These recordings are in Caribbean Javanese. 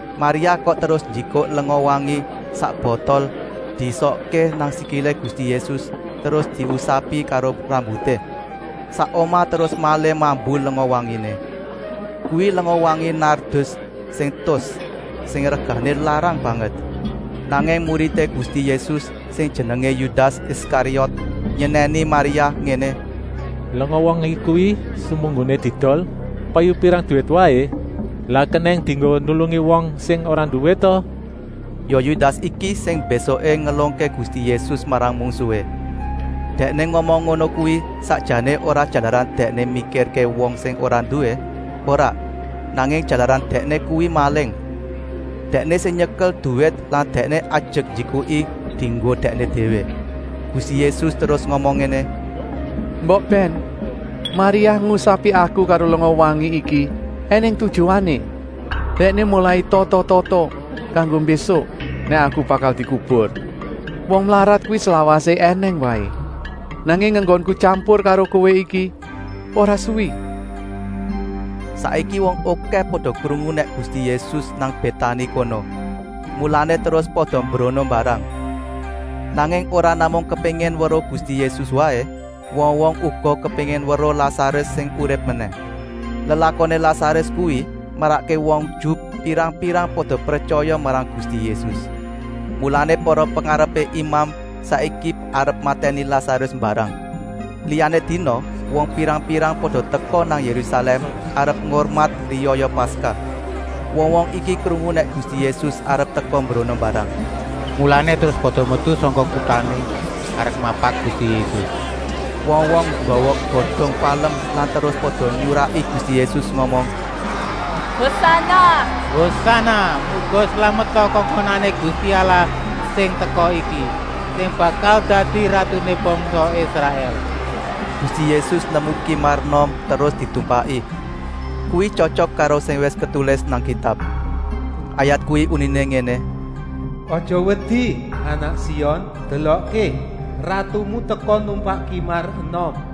Maria kok terus njikuk lenga-wangi sak botol diesokké nang sikilé Gusti Yésus terus diusapi karo rambuté. Sak omah terus malih mambu lenga-wanginé. Kuwi lenga-wangi nardus sing tus, sing regané larang banget. Nanging muridé Gusti Yésus sing jenengé Yudas Iskariot, nyenèni Maria ngéné: “Lenga-wangi kuwi semunggoné diedol payu pirang duwit waé, lak kenèng dienggo nulungi wong sing ora nduwé ta?” Ya Yudas iki sing mbésuké ngelungké Gusti Yésus marang mungsuhé. Dèkné ngomong ngono kuwi sakjané ora jalaran dèkné mikirké wong sing ora nduwé, ora, nanging jalaran dèkné kuwi maling. Dèkné sing nyekel duwit lan dèkné ajek njikuki dienggo dèkné déwé. Gusti Yésus terus ngomong ngéné: “Mbok bèn! Maria ngusapi Aku karo lenga-wangi iki ènèng tujuané. Dèkné molai tata-tata kanggo mbésuk nèk Aku bakal dikubur. Wong mlarat kuwi slawasé ènèng waé, nanging enggonku tyampur karo kowé iki ora suwi.” Saiki wong okèh pada krungu nèk Gusti Yésus nang Bétani kono, mulané terus pada mbrono mbarang. Nanging ora namung kepéngin weruh Gusti Yésus waé, wong-wong uga kepéngin weruh Lasarus sing urip menèh. Lelakoné Lasarus kuwi marakké wong Ju pirang-pirang pada pretyaya marang Gusti Yésus. Mulané para pengarepé imam saiki arep matèni Lasarus mbarang. Liyané dina wong pirang-pirang pada teka nang Yérusalèm arep ngurmat riyaya Paskah. Wong-wong iki krungu nèk Gusti Yésus arep teka mbrono mbarang. Mulané terus pada metu sangka kutané arep mapak Gusti Yésus. Wong-wong nggawa godong palem terus pada nyuraki Gusti Yésus ngomong: “Hosana, muga slameta kongkonané Gusti Allah sing teka iki, sing bakal dadi ratuné bangsa Israèl.” Gusti Yésus nemu kimar enom terus ditumpaki. Kuwi tyotyok karo sing wis ketulis nang Kitab. Ayat kuwi uniné ngéné: “Aja wedi, anak Sion! Delokké, ratumu teka numpak kimar enom.”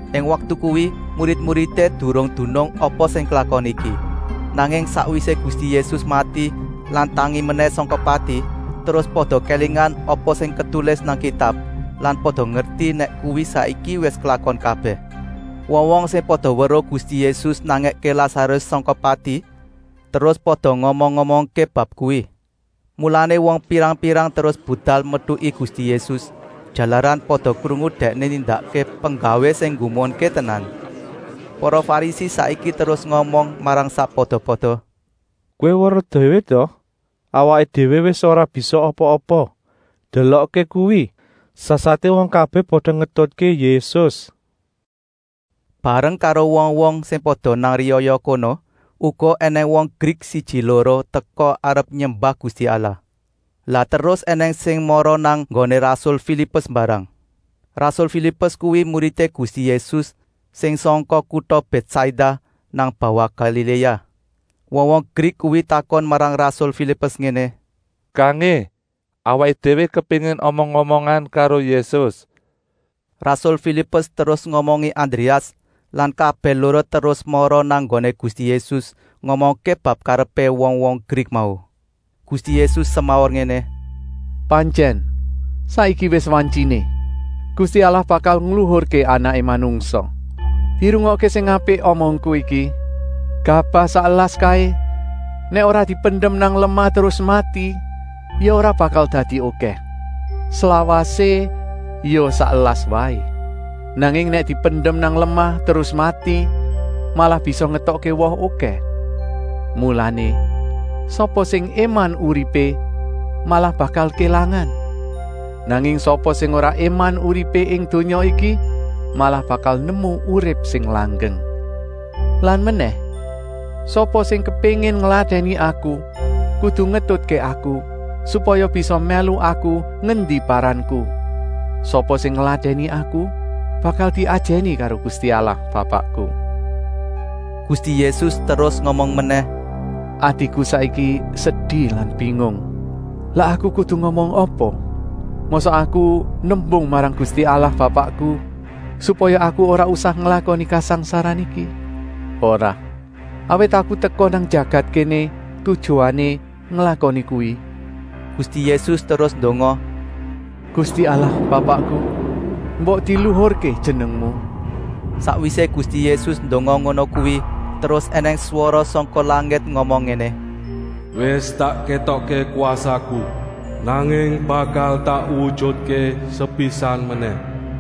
Ing waktu kuwi murid-muridé durung dunung apa sing klakon iki, nanging sakwisé Gusti Yésus mati lan tangi menèh sangka pati terus pada kélingan apa sing ketulis nang Kitab lan pada ngerti nèk kuwi saiki wis klakon kabèh. Wong-wong sing pada weruh Gusti Yésus nangèké Lasarus sangka pati terus pada ngomong-omongké bab kuwi. Mulané wong pirang-pirang terus budal metuki Gusti Yésus, jalaran pada krungu Dèkné nindakké penggawé sing nggumunké tenan. Para Farisi saiki terus ngomong marang sakpada-pada: “Kowé weruh déwé ta! Awaké déwé wis ora bisa apa-apa! Delokké kuwi! Sasaté wong kabèh pada ngetutké Yésus!” Bareng karo wong-wong sing pada nang riyaya kono uga ènèng wong Grik siji-loro teka arep nyembah Gusti Allah. Lah terus ènèng sing mara nang nggoné rasul Filipus mbarang. Rasul Filipus kuwi muridé Gusti Yésus sing sangka kuta Bètsaida nang bawah Galiléa. Wong-wong Grik kuwi takon marang rasul Filipus ngéné: “Kangé, awaké déwé kepéngin omong-omongan karo Yésus!” Rasul Filipus terus ngomongi Andréas lan kabèh loro terus mara nang nggoné Gusti Yésus ngomongké bab karepé wong-wong Grik mau. Gusti Yésus semaur ngéné: “Pantyèn, saiki wis wantyiné. Gusti Allah bakal ngluhurké Anaké Manungsa. Dirungokké sing apik omongku iki: gabah sak elas kaé nèk ora dipendem nang lemah terus mati ya ora bakal dadi okèh. Slawasé ya sak elas waé. Nanging nèk dipendem nang lemah terus mati, malah bisa ngetokké woh okèh. Mulané, sapa sing éman uripé malah bakal kélangan. Nanging sapa sing ora éman uripé ing donya iki, malah bakal nemu urip sing langgeng. Lan menèh, sapa sing kepéngin ngladèni Aku kudu ngetutké Aku, supaya bisa mèlu Aku ngendi paranku. Sapa sing ngladèni Aku bakal diajèni karo Gusti Allah Bapakku.” Gusti Yésus terus ngomong menèh: “Atiku saiki sedi lan bingung. Lah Aku kudu ngomong apa? Mosok Aku nembung marang Gusti Allah Bapakku supaya Aku ora usah nglakoni kasangsaran iki? Ora, awit Aku teka nang jagat kéné tujuané nglakoni kuwi!” Gusti Yésus terus ndonga: “Gusti Allah Bapakku, mbok diluhurké Jenengmu!” Sakwisé Gusti Yésus ndonga ngono kuwi terus ènèng swara sangka langit ngomong ngéné: “Wis tak kétokké kwasaku, nanging bakal tak wujutké sepisan menèh!”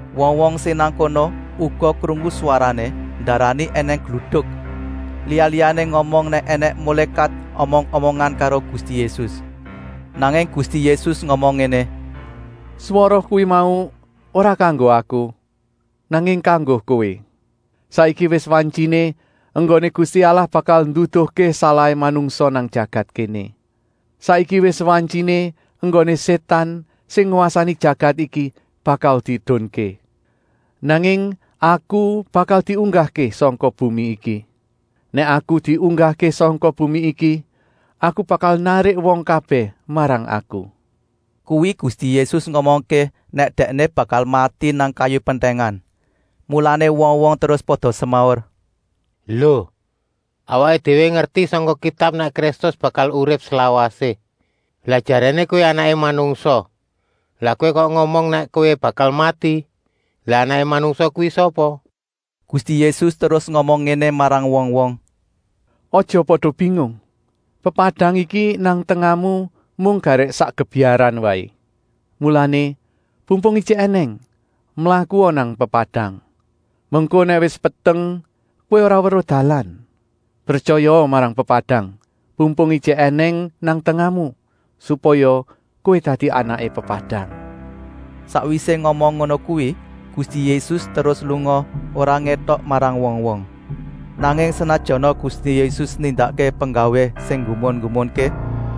Wong-wong sing nang kono uga krungu swarané, ndarani ènèng gluduk. Liya-liyané ngomong nèk ènèng mulékat omong-omongan karo Gusti Yésus. Nanging Gusti Yésus ngomong ngéné: “Swara kuwi mau ora kanggo Aku, nanging kanggo kowé. Saiki wis wantyiné enggoné Gusti Allah bakal nduduhké salahé manungsa nang jagat kéné. Saiki wis wantyiné enggoné Sétan, sing ngwasani jagat iki, bakal diedunké. Nanging Aku bakal diunggahké sangka bumi iki. Nèk Aku diunggahké sangka bumi iki, Aku bakal narik wong kabèh marang Aku!” Kuwi Gusti Yésus ngomongké nèk Dèkné bakal mati nang kayu pentèngan. Mulané wong-wong terus pada semaur: “Lo, awaké déwé ngerti sangka Kitab nèk Kristus bakal urip slawasé. Lah jaréné Kowé Anaké Manungsa, lah Kowé kok ngomong nèk Kowé bakal mati. Lah Anaké Manungsa kuwi sapa?” Gusti Yésus terus ngomong ngéné marang wong-wong: “Aja pada bingung. Pepadang iki nang tengahmu mung garèk sak gebyaran waé. Mulané, pumpung ijik ènèng, mlakua nang pepadang. Mengko nèk wis peteng kowé ora weruh dalan. Pretyayaa marang pepadang, pumpung ijik ènèng nang tengahmu, supaya kowé dadi anaké pepadang.” Sakwisé ngomong ngono kuwi Gusti Yésus terus lunga, ora ngétok marang wong-wong. Nanging senajana Gusti Yésus nindakké penggawé sing nggumun-nggumunké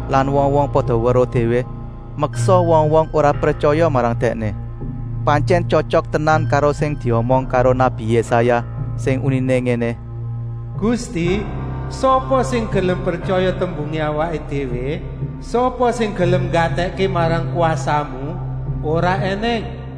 lan wong-wong pada weruh déwé, meksa wong-wong ora pretyaya marang Dèkné. Pantyèn tyotyok tenan karo sing diomong karo nabi Yésaya, sing uniné ngéné: “Gusti, sapa sing gelem pretyaya tembungé awaké déwé? Sapa sing gelem nggatèkké marang kwasamu? Ora ènèng!”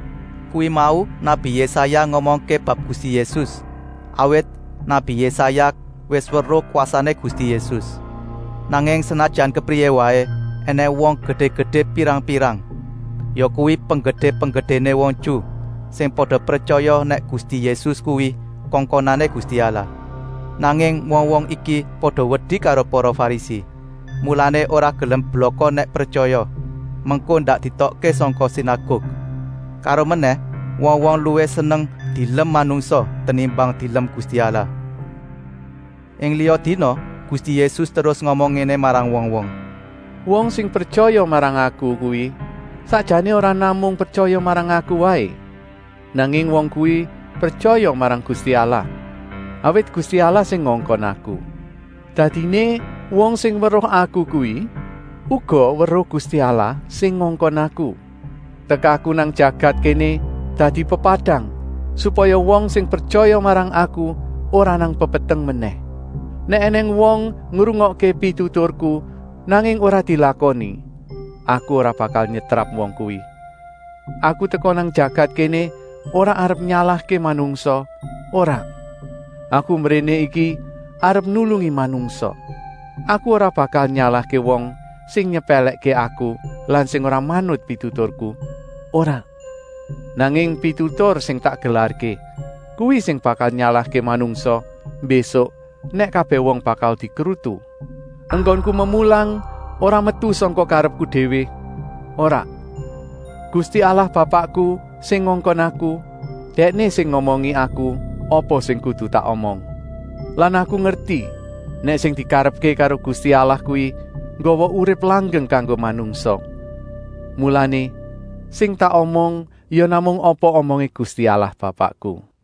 Kuwi mau nabi Yésaya ngomongké bab Gusti Yésus, awit nabi Yésaya wis weruh kwasané Gusti Yésus. Nanging senajan kepriyé waé ènèng wong gedé-gedé pirang-pirang, yakuwi penggedé-penggedéné wong Ju, sing pada pretyaya nèk Gusti Yésus kuwi kongkonané Gusti Allah. Nanging wong-wong iki pada wedi karo para Farisi, mulané ora gelem blaka nèk pretyaya, mengko ndak dietokké sangka sinaguk. Karomenèh wong-wong luwih seneng dielem manungsa tenimbang dielem Gusti Allah. Ing liya dina Gusti Yésus terus ngomong ngéné marang wong-wong: “Wong sing pretyaya marang Aku kuwi sakjané ora namung pretyaya marang Aku waé, nanging wong kuwi pretyaya marang Gusti Allah, awit Gusti Allah sing ngongkon Aku. Dadiné wong sing weruh Aku kuwi uga weruh Gusti Allah sing ngongkon Aku. Tekaku nang jagat kéné dadi pepadang, supaya wong sing pretyaya marang Aku ora nang pepeteng menèh. Nèk ènèng wong ngrungokké pituturku nanging ora dilakoni, Aku ora bakal nyetrap wong kuwi. Aku teka nang jagat kéné ora arep nyalahké manungsa, ora. Aku mbréné iki arep nulungi manungsa. Aku ora bakal nyalahké wong sing nyepèlèkké Aku lan sing ora manut pituturku, ora! Nanging pitutur sing tak gelarké, kuwi sing bakal nyalahké manungsa, mbésuk nèk kabèh wong bakal dikrutu. Enggonku memulang ora metu sangka karepku déwé, ora. Gusti Allah Bapakku sing ngongkon Aku, Dèkné sing ngomongi Aku apa sing kudu tak omong. Lan Aku ngerti nèk sing dikarepké karo Gusti Allah kuwi nggawa urip langgeng kanggo manungsa. Mulané, sing tak omong ya namung apa omongé Gusti Allah Bapakku.”